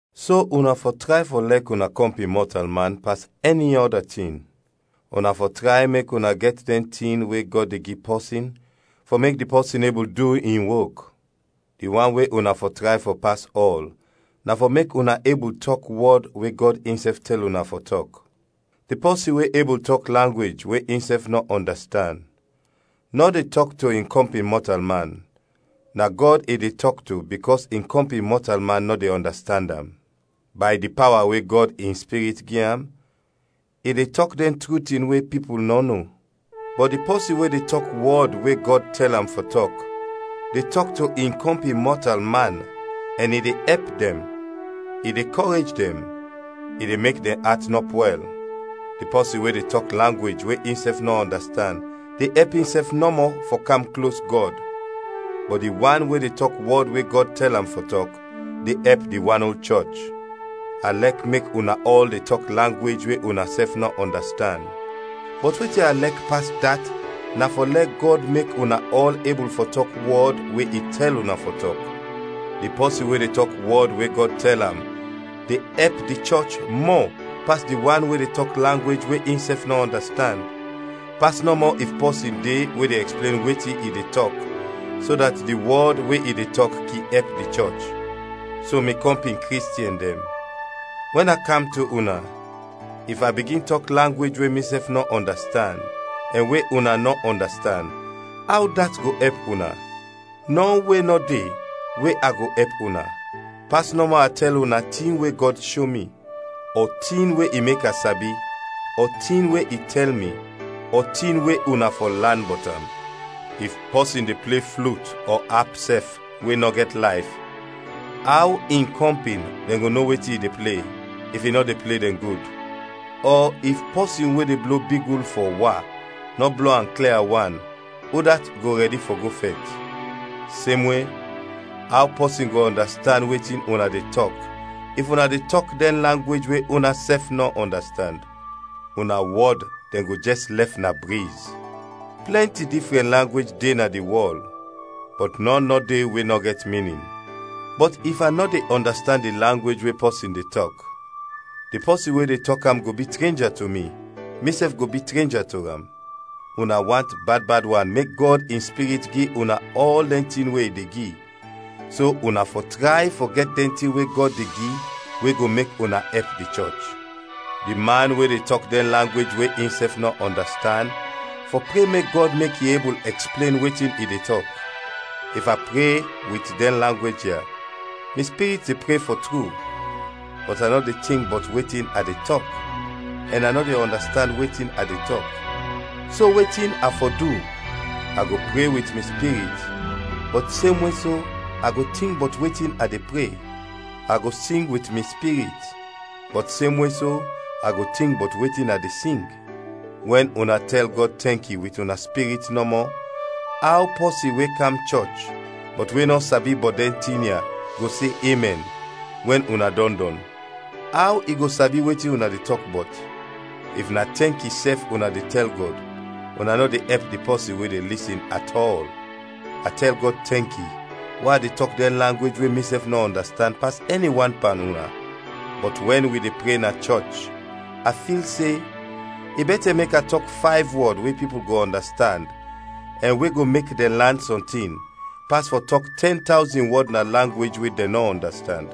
So una fɔ tray fɔ lɛk una kɔmpin mɔtalman pas ɛni ɔda tin. Una fɔ tray mek una gɛt dɛn tin we Gɔd de gi pɔsin fɔ mek di pɔsin ebul du in wok; di wan we una fɔ tray fɔ pas ɔl na fɔ mek una ebul tɔk wɔd we Gɔd insɛf tɛl una fɔ tɔk. Di pɔsin we ebul tɔk langwej we insɛf nɔ ɔndastand, nɔ de tɔk to in kɔmpin mɔtalman, na Gɔd i de tɔk to bikɔs in kɔmpin mɔtalman nɔ de ɔndastand am. Bay di pawa we Gɔd in Spirit gi am, i de tɔk dɛn tru tin we pipul nɔ no. Bɔt di pɔsin we de tɔk wɔd we Gɔd tɛl am fɔ tɔk, de tɔk to in kɔmpin mɔtalman ɛn i de ɛp dɛn, i de kɔrej dɛn, i de mek dɛn at nɔ pwɛl. Di pɔsin we de tɔk langwej we insɛf nɔ ɔndastand de ɛp insɛf nɔmɔ fɔ kam klos Gɔd, bɔt di wan we de tɔk wɔd we Gɔd tɛl am fɔ tɔk, de ɛp di wan ol chɔch. A lɛk mek una ɔl de tɔk langwej we unasɛf nɔ ɔndastand, bɔt wetin a lɛk pas dat na fɔ lɛ Gɔd mek una ɔl ebul fɔ tɔk wɔd we i tɛl una fɔ tɔk. Di pɔsin we de tɔk wɔd we Gɔd tɛl am de ɛp di chɔch mɔ pas di wan we de tɔk langwej we insɛf nɔ ɔndastand, pas nɔmɔ if pɔsin de we de ɛksplen wetin i de tɔk so dat di wɔd we i de tɔk kin ɛp di chɔch. So, mi kɔmpin Kristiɛn dɛn, wɛn a kam to una, if a bigin tɔk langwej we misɛf nɔ ɔndastand ɛn we una nɔ ɔndastand, aw dat go ɛp una? Nɔ we nɔ de we a go ɛp una, pas nɔmɔ a tɛl una tin we Gɔd sho mi, ɔ tin we i mek a sabi, ɔ tin we i tɛl mi, ɔ tin we una fɔ lan bɔt am. If pɔsin de ple flut ɔ ap sɛf we nɔ gɛt layf, aw in kɔmpin dɛn go no wetin i de ple, if i nɔ de ple dɛn gud? Ɔ if pɔsin we de blo bigul fɔ wa, nɔ blo am klia wan, udat go rɛdi fɔ go fɛt? Semwe, aw pɔsin go ɔndastand wetin una de tɔk if una de tɔk dɛn langwej we unasɛf nɔ ɔndastand? Una wɔd dɛn go jɛs lɛf na briz! Plɛnti difrɛn langwej de na di wɔl, bɔt nɔn nɔ de we nɔ gɛt minin. Bɔt if a nɔ de ɔndastand di langwej we pɔsin de tɔk, di pɔsin we de tɔk am go bi trenja to mi, misɛf go bi trenja to am. Una want bad bad wan mek Gɔd in Spirit gi una ɔl dɛn tin we i de gi, so una fɔ tray fɔ gɛt dɛn tin we Gɔd de gi we go mek una ɛp di chɔch. Di man we de tɔk dɛn langwej we insɛf nɔ ɔndastand fɔ pre mek Gɔd mek i ebul ɛksplen wetin i de tɔk. If a pre wit dɛn langwej ya, mi spirit de pre fɔ tru, bɔt a nɔ de tink bɔt wetin a de tɔk, ɛn a nɔ de ɔndastand wetin a de tɔk. So wetin a fɔ du? A go pre wit mi spirit, bɔt semwe so a go tink bɔt wetin a de pre: a go sing wit mi spirit, bɔt semwe so a go tink bɔt wetin a de sing. Wɛn una tɛl Gɔd tɛnki wit una spirit nɔmɔ, aw pɔsin we kam chɔch, bɔt we nɔ sabi bɔt dɛn tin ya, go se “Emɛn” wɛn una dɔn dɔn? Aw i go sabi wetin una de tɔk bɔt? If na tɛnki sɛf una de tɛl Gɔd, una nɔ de ɛp di pɔsin we de lisin atɔl. A tɛl Gɔd tɛnki we a de tɔk dɛn langwej we misɛf nɔ ɔndastand pas ɛni wan pan una. Bɔt wɛn wi de pre na chɔch, a fil se, i bɛtɛ mek a tɔk fayv wɔd we pipul go ɔndastand, ɛn we go mek dɛn lan sɔntin, pas fɔ tɔk tɛn tawzin wɔd na langwej we dɛn nɔ ɔndastand.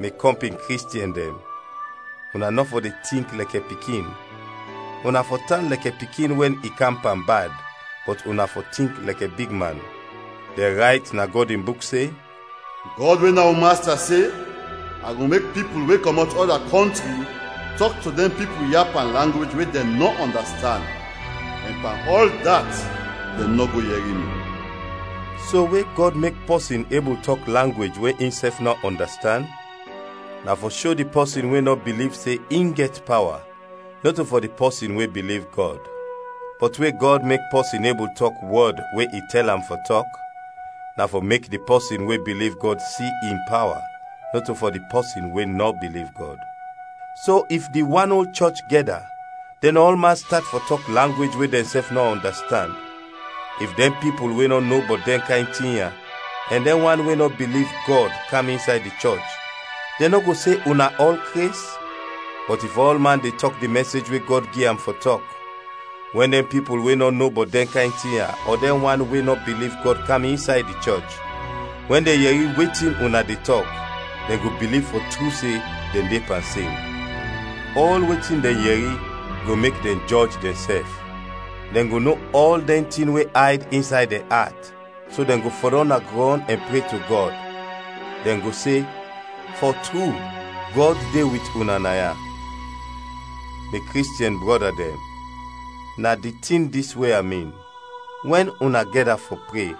Mi kɔmpin Kristiɛn dɛn, una nɔ fɔ de tink lɛkɛ pikin, una fɔ tan lɛkɛ pikin wɛn i kam pan bad, bɔt una fɔ tink lɛkɛ big man. Dɛn rayt na Gɔd in Buk se, “Gɔd we na wi Masta se, a go mek pipul we kɔmɔt ɔda kɔntri tɔk to dɛn pipul ya langwej we dɛn nɔ ɔndastand, ɛn pan ɔl dat dɛn nɔ go yɛri mi.” So, we Gɔd mek pɔsin ebul tɔk langwej we insɛf nɔ ɔndastand, na fɔ sho di pɔsin we nɔ biliv se in gɛt pawa, nɔto fɔ di pɔsin we biliv Gɔd; bɔt we Gɔd mek pɔsin ebul tɔk wɔd we i tɛl am fɔ tɔk, na fɔ mek di pɔsin we biliv Gɔd si in pawa, nɔto fɔ di pɔsin we nɔ biliv Gɔd. So, if di wan ol chɔch gɛda, dɛn ɔlman stat fɔ tɔk langwej we dɛnsɛf nɔ ɔndastand, if dɛn pipul we nɔ no bɔt dɛn kayn tin ya, ɛn dɛn wan we nɔ biliv Gɔd kam insay di chɔch, dɛn nɔ go se una ɔl kres? Bɔt if ɔlman de tɔk di mɛsej we Gɔd gi am fɔ tɔk, wɛn dɛn pipul we nɔ no bɔt dɛn kayn tin ya ɔ dɛn wan we nɔ biliv Gɔd kam insay di chɔch, wɛn dɛn yɛri wetin una de tɔk, dɛn go biliv fɔ tru se dɛn de pan sin. Ɔl wetin dɛn yɛri go mek dɛn jɔj dɛnsɛf. Dɛn go no ɔl dɛn tin we ayd insay dɛn at, so dɛn go fɔdɔm na grɔn ɛn pre to Gɔd; dɛn go se, “Fɔ tru, Gɔd de wit una naya!” Mi Kristiɛn brɔda dɛn, na di tin dis we a min: wɛn una gɛda fɔ pre,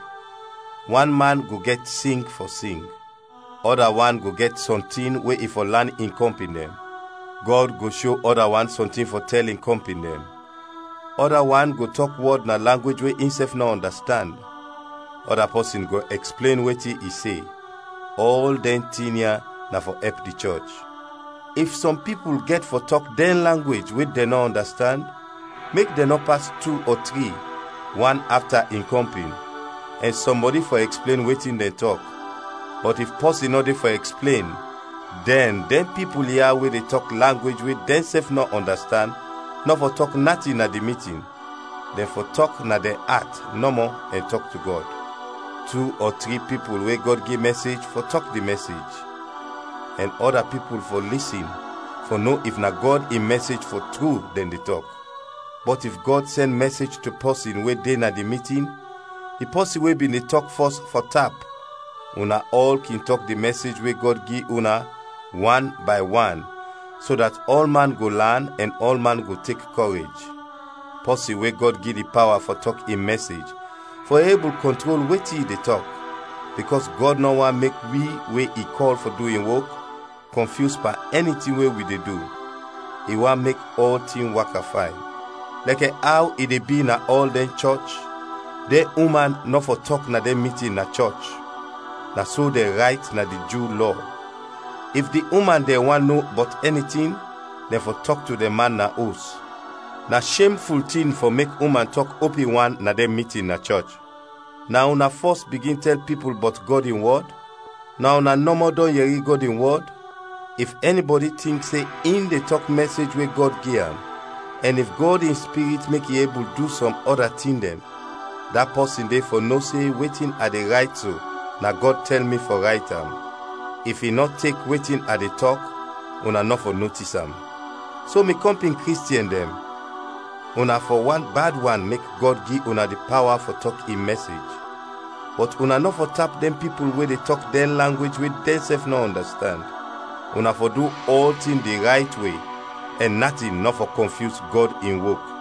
wan man go gɛt sing fɔ sing; ɔda wan go gɛt sɔntin we i fɔ lan in kɔmpin dɛn; Gɔd go sho ɔda wan sɔntin fɔ tɛl in kɔmpin dɛn; ɔda wan go tɔk wɔd na langwej we insɛf nɔ ɔndastand; ɔda pɔsin go ɛksplen wetin i se. Ɔl dɛn tin ya na fɔ ɛp di chɔch. If sɔm pipul gɛt fɔ tɔk dɛn langwej we dɛn nɔ ɔndastand, mek dɛn nɔ pas tu ɔ tri, wan afta in kɔmpin, ɛn sɔmbɔdi fɔ ɛksplen wetin dɛn tɔk. Bɔt if pɔsin nɔ de fɔ ɛksplen, dɛn dɛn pipul ya we de tɔk langwej we dɛnsɛf nɔ ɔndastand nɔ fɔ tɔk natin na di mitin, dɛn fɔ tɔk na dɛn at nɔmɔ ɛn tɔk to Gɔd. Tu ɔ tri pipul we Gɔd gi mɛsej fɔ tɔk di mɛsej, ɛn ɔda pipul fɔ lisin fɔ no if na Gɔd in mɛsej fɔ tru dɛn de tɔk. Bɔt if Gɔd sɛn mɛsej to pɔsin we de na di mitin, di pɔsin we bin de tɔk fɔs fɔ tap. Una ɔl kin tɔk di mɛsej we Gɔd gi una, wan bay wan, so dat ɔlman go lan ɛn ɔlman go tek kɔrej. Pɔsin we Gɔd gi di pawa fɔ tɔk in mɛsej fɔ ebul kɔntrol wetin i de tɔk, bikɔs Gɔd nɔ want mek wi we i kɔl fɔ du in wok, kɔnfyus pan ɛni tin we wi de du. I want mek ɔltin waka fayn. Lɛkɛ aw i de bi na ɔl dɛn chɔch, dɛn uman nɔ fɔ tɔk na dɛn mitin na chɔch; na so dɛn rayt na di Ju Lɔ. If di uman dɛn want no bɔt ɛni tin, dɛn fɔ tɔk to dɛn man na os. Na shem tin fɔ mek uman tɔk opin wan na dɛn mitin na chɔch. Na una fɔs bigin tɛl pipul bɔt Gɔd in wɔd? Na una nɔmɔ dɔn yɛri Gɔd in wɔd? If ɛnibɔdi tink se in de tɔk mɛsej we Gɔd gi am, ɛn if Gɔd in Spirit mek i ebul du sɔm ɔda tin dɛn, da pɔsin de fɔ no se wetin a de rayt so na Gɔd tɛl mi fɔ rayt am. If i nɔ tek wetin a de tɔk, una nɔ fɔ notis am. So, mi kɔmpin Kristiɛn dɛn, una fɔ want bad wan mek Gɔd gi una di pawa fɔ tɔk in mɛsej, bɔt una nɔ fɔ tap dɛn pipul we de tɔk dɛn langwej we dɛnsɛf nɔ ɔndastand. Una fɔ du ɔltin di rayt we ɛn natin nɔ fɔ kɔnfyus Gɔd in wok.